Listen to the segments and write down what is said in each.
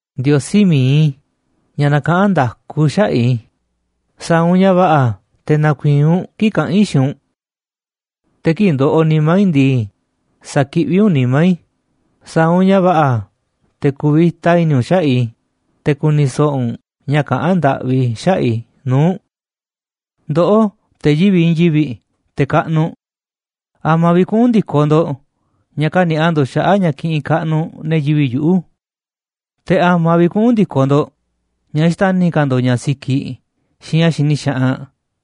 Ndiosí mi̱iꞌ i̱, ña̱ nakaꞌán nda̱ku xaꞌa̱ꞌ i̱, sa̱a̱ u̱nꞌ ña̱ va̱ꞌa̱ te̱ na̱ku̱i̱i̱n u̱nꞌ kii̱ꞌ kaꞌán i̱ xiinꞌ u̱nꞌ. Te̱ kii̱ꞌ ndoꞌoꞌ nimá i̱ ndii, sa̱kiꞌví u̱nꞌ nimá i̱, sa̱a̱ u̱nꞌ ña̱ va̱ꞌa̱ te̱ ku̱vi̱ta i̱ni̱ u̱nꞌ xaꞌa̱ꞌ i̱, te̱ ku̱ni̱ so̱ꞌo̱ u̱nꞌ ña̱ kaꞌán ndaꞌvi i̱ xaꞌa̱ꞌ i̱ nuu̱ꞌ u̱nꞌ. Ndoꞌó, te̱ yivi̱ꞌ i̱i̱n yivi̱ꞌ, te̱ kaꞌnuꞌ, ¿a̱ma̱ vi̱ꞌ kuꞌu̱n ndi̱koꞌ ndo̱ꞌ ña̱ kani̱a̱ꞌa ndo̱ꞌ xaꞌa̱ꞌ ña̱ kiꞌinꞌ kaꞌnuꞌ ne̱ yivi̱ꞌ yuꞌu̱? Te̱ ¿a̱ma̱ vi̱ꞌ kuꞌu̱n ndi̱koꞌ ndo̱ꞌ ña̱ xtani̱ ka̱ ndo̱ꞌ ña̱ sikiꞌ xiinꞌ ña̱ xini xaꞌanꞌ?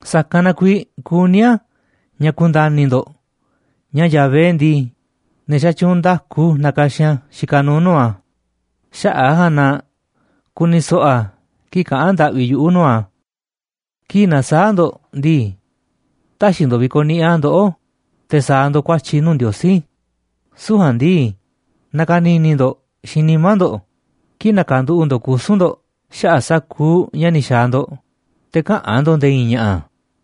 Sa̱kanꞌ na kuiiꞌ kuní i̱ ña̱ ku̱nda̱ni̱ ndo̱ꞌ ña̱ Yahvé ndii, ne̱ xatyuunꞌ nda̱ku nakaxin a̱ xikaꞌ nuuꞌ nuu̱ꞌ a̱, xaꞌa̱ꞌ a̱ ja̱a̱nꞌ na ku̱ni̱ so̱ꞌo̱ a̱ kii̱ꞌ kaꞌa̱n ndaꞌvi yuꞌu̱ nuu̱ꞌ a̱. Kii̱ꞌ na̱saa̱ꞌ ndo̱ꞌ ndii, tä̱xi̱ ndo̱ꞌ vi̱ko̱ꞌniꞌiꞌ a̱ ndoꞌó te̱ sa̱a̱ ndo̱ꞌ ku̱a̱tyi̱ nuu̱ꞌ Ndiosí, süu̱ꞌ ja̱a̱nꞌ ndii, na̱ka̱ni̱ni̱ ndo̱ꞌ xiinꞌ nimá ndo̱ꞌ kii̱ꞌ na̱ka̱nduꞌu̱ꞌ ndo̱ꞌ kusu̱n ndo̱ꞌ xaꞌa̱ꞌ sa̱kuuꞌ ña̱ ni̱ xa̱a̱ ndo̱ꞌ, te̱ käꞌa̱n ndo̱ꞌ nde̱e̱ i̱i̱n ña̱ꞌa̱.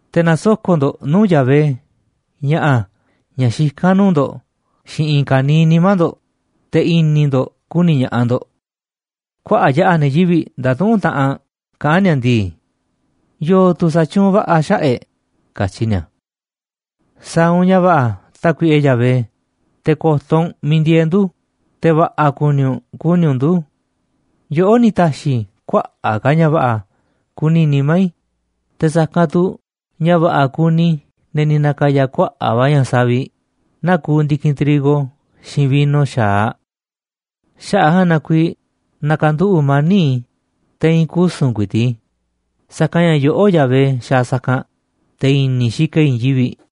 Te̱ na̱soko̱ꞌ ndo̱ꞌ nuu̱ꞌ Yahvé ña̱ꞌa̱ ña̱ xikán a̱ nuu̱ꞌ ndo̱ꞌ xiinꞌ i̱i̱n ka̱niiꞌ nimá ndo̱ꞌ, te̱ i̱ni̱ ndo̱ꞌ ku̱ni̱ ña̱ꞌaꞌ ndo̱ꞌ. Kuaꞌa̱ꞌ yaꞌa̱ ne̱ yivi̱ꞌ ndatuꞌúnꞌ taꞌanꞌ kaꞌán ni̱a̱ ndii: “¿Yo̱o̱ tu̱ sa̱tyuunꞌ va̱ꞌa̱ xaꞌa̱ꞌ e̱ꞌ?” katyi ni̱a̱. Sa̱a̱ u̱nꞌ ña̱ va̱ꞌa̱, Tákuiꞌe Yahvé, te̱ ko̱to̱ u̱nꞌ miiꞌ ndieeꞌ ndu̱, te̱ va̱ꞌa̱ ku̱ni̱ u̱nꞌ ku̱ni̱ u̱nꞌ ndu̱. Yoꞌó ni̱ ta̱xi̱ kuaꞌa̱ꞌ ka̱ ña̱ va̱ꞌa̱ kuni nimá i̱, te̱ sa̱kanꞌ tu̱ ña̱ va̱ꞌa̱ kuni ne̱ ni̱ na̱ka̱ya̱ kuaꞌa̱ꞌ va̱ ña̱ savi̱ꞌ naa kuuꞌ ndi̱kinꞌ trigo xiinꞌ vino xa̱aꞌ. Xaꞌa̱ꞌ a̱ ja̱a̱nꞌ na kuiiꞌ na̱ka̱nduꞌu̱ꞌ mani̱ꞌ i̱, te̱ i̱i̱n kusu̱n ku̱i̱ti̱ꞌ i̱, sa̱kanꞌ ña̱ yoꞌó, Yahvé, xaaꞌ sa̱kanꞌ, te̱ i̱ni̱ i̱ xikaꞌ i̱ i̱i̱n yivi̱ꞌ.